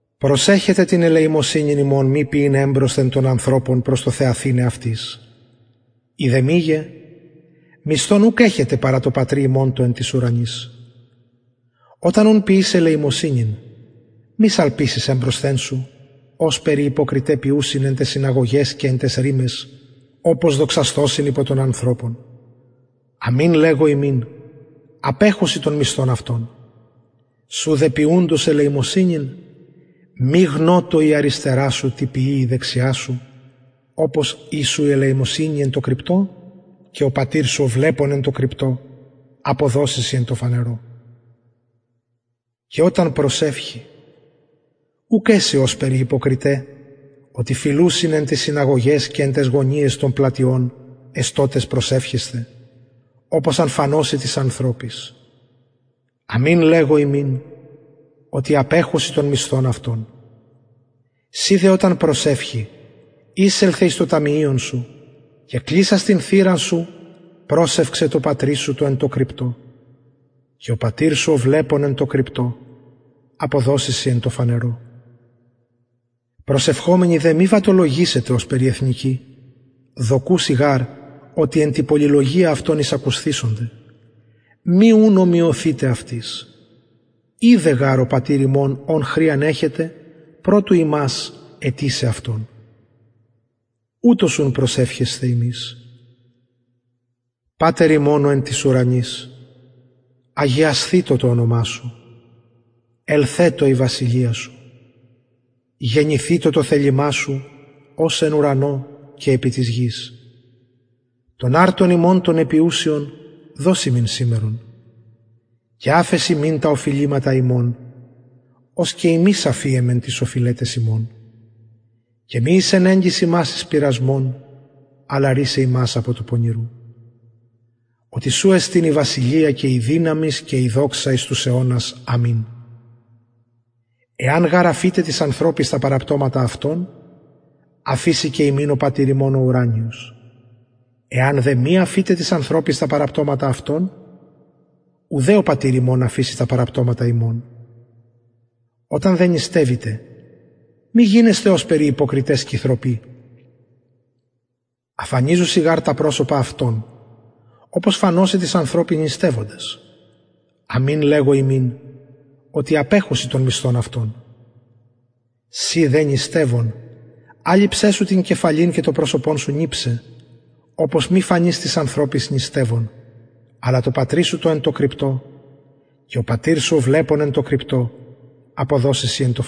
προσεχετε την ελεημοσυνην υμων μη ποιειν εμπροσθεν των ανθρωπων προς το θεαθηναι αυτοις ει δε μηγε μισθον ουκ εχετε παρα τω πατρι υμων τω εν τοις ουρανοις οταν ουν ποιης ελεημοσυνην μη σαλπισης εμπροσθεν σου ωσπερ οι υποκριται ποιουσιν εν ταις συναγωγαις και εν ταις ρυμαις οπως δοξασθωσιν υπο των ανθρωπων αμην λεγω υμιν απεχουσιν τον μισθον αυτων σου δε ποιουντος ελεημοσυνην μη γνωτω η αριστερα σου τι ποιει η δεξια σου οπως η σου η ελεημοσυνη εν τω κρυπτω και ο πατηρ σου ο βλεπων εν τω κρυπτω αυτος αποδωσει σοι εν τω φανερω και οταν προσευχη ουκ εση ωσπερ οι υποκριται οτι φιλουσιν εν ταις συναγωγαις και εν ταις γωνιαις των πλατειων εστωτες προσευχεσθαι οπως αν φανωσιν τοις ανθρωποις αμην λεγω υμιν οτι απεχουσιν τον μισθον αυτων συ δε οταν προσευχη εισελθε εις το ταμιειον σου και κλεισας την θυραν σου προσευξαι τω πατρι σου τω εν τω κρυπτω και ο πατηρ σου ο βλεπων εν τω κρυπτω αποδωσει σοι εν τω φανερω προσευχομενοι δε μη βαττολογησητε ωσπερ οι εθνικοι δοκουσιν γαρ οτι εν τη πολυλογια αυτων εισακουσθησονται μη ουν ομοιωθητε αυτοις οιδεν γαρ ο πατηρ υμων ων χρειαν εχετε προ του υμας αιτησαι αυτον ουτως ουν προσευχεσθε υμεις πατερ ημων ο εν τοις ουρανοις αγιασθητω το ονομα σου ελθετω η βασιλεια σου γενηθητω το θελημα σου ως εν ουρανω και επι της γης τον αρτον ημων τον επιουσιον δος ημιν σημερον και αφες ημιν τα οφειληματα ημων ως και ημεις αφιεμεν τοις οφειλεταις ημων και μη εισενεγκης ημας εις πειρασμον αλλα ρυσαι ημας απο του πονηρου οτι σου εστιν η βασιλεια και η δυναμις και η δοξα εις τους αιωνας αμην εαν γαρ αφητε τοις ανθρωποις τα παραπτωματα αυτων αφησει και υμιν ο πατηρ υμων ο ουρανιος εαν δε μη αφητε τοις ανθρωποις τα παραπτωματα αυτων ουδε ο πατηρ υμων αφησει τα παραπτωματα υμων οταν δε νηστευητε μη γινεσθε ωσπερ οι υποκριται σκυθρωποι αφανιζουσιν γαρ τα προσωπα αυτων οπως φανωσιν τοις ανθρωποις νηστευοντες αμην λεγω υμιν οτι απεχουσιν τον μισθον αυτων συ δε νηστευων αλειψαι σου την κεφαλην και το προσωπον σου νιψαι οπως μη φανης τοις ανθρωποις νηστευων αλλα τω πατρι σου τω εν τω κρυπτω και ο πατηρ σου ο βλεπων εν τω κρυπτω αποδωσει σοι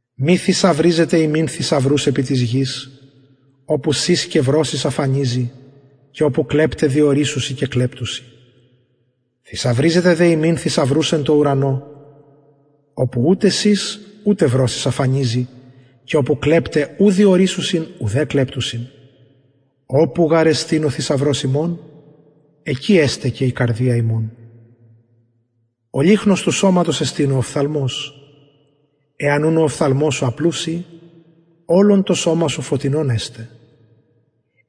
μη θησαυριζετε υμιν θησαυρους επι της γης οπου σης και βρωσις αφανιζει και οπου κλεπται διορυσσουσιν και κλεπτουσιν θησαυριζετε δε υμιν θησαυρους εν ουρανω οπου ουτε σης ουτε βρωσις αφανιζει και οπου κλεπται ου διορυσσουσιν ουδε κλεπτουσιν οπου γαρ εστιν ο θησαυρος υμων εκει εσται και η καρδια υμων ο λυχνος του σωματος εστιν ο οφθαλμος εαν ουν ο οφθαλμος σου απλους η ολον το σωμα σου φωτεινον εσται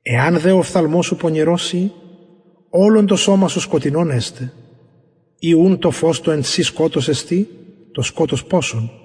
εαν δε ο οφθαλμος σου πονηρος η ολον το σωμα σου σκοτεινον εσται ει ουν το φως το εν σοι σκοτος εστιν το σκοτος ποσον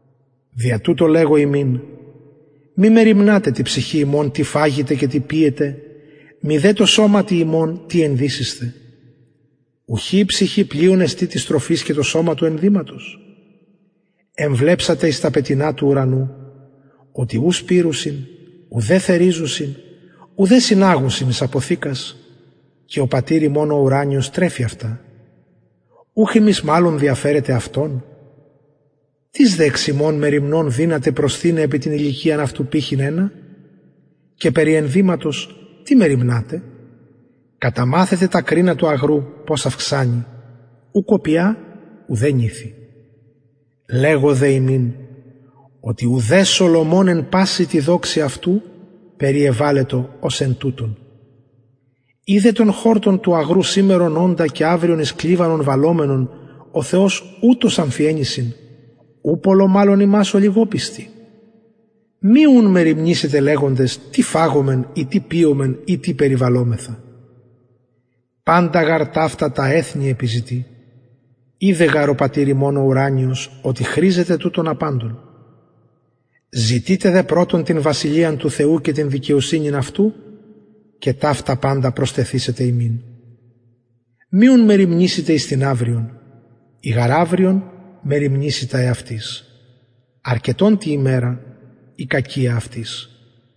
δια τουτο λεγω υμιν μη μεριμνατε τη ψυχη υμων τι φαγητε και τι πιητε μηδε τω σωματι υμων τι ενδυσησθε ουχι η ψυχη πλειον εστιν της τροφης και το σωμα του ενδυματος εμβλεψατε εις τα πετεινα του ουρανου οτι ου σπειρουσιν ουδε θεριζουσιν ουδε συναγουσιν εις αποθηκας και ο πατηρ υμων ο ουρανιος τρεφει αυτα ουχ υμεις μαλλον διαφερετε αυτων τις δε εξ υμων μεριμνων δυναται προσθειναι επι την ηλικιαν αυτου πηχυν ενα και περι ενδυματος τι μεριμνατε καταμαθετε τα κρινα του αγρου πως αυξανει ου κοπια ουδε νηθει λεγω δε υμιν οτι ουδε σολομων εν παση τη δοξη αυτου περιεβαλετο ως εν τουτων ει δε τον χορτον του αγρου σημερον οντα και αυριον εις κλιβανον βαλλομενον ο θεος ουτως αμφιεννυσιν ου πολλω μαλλον υμας ολιγοπιστοι μη ουν μεριμνησητε λεγοντες τι φαγωμεν η τι πιωμεν η τι περιβαλωμεθα παντα γαρ ταυτα τα εθνη επιζητει οιδεν γαρ ο πατηρ υμων ο ουρανιος οτι χρηζετε τουτων απαντων ζητειτε δε πρωτον την βασιλειαν του θεου και την δικαιοσυνην αυτου και ταυτα παντα προστεθησεται υμιν μη ουν μεριμνησητε εις την αυριον η γαρ αυριον μεριμνησει τα εαυτης αρκετον τη ημερα η κακια αυτης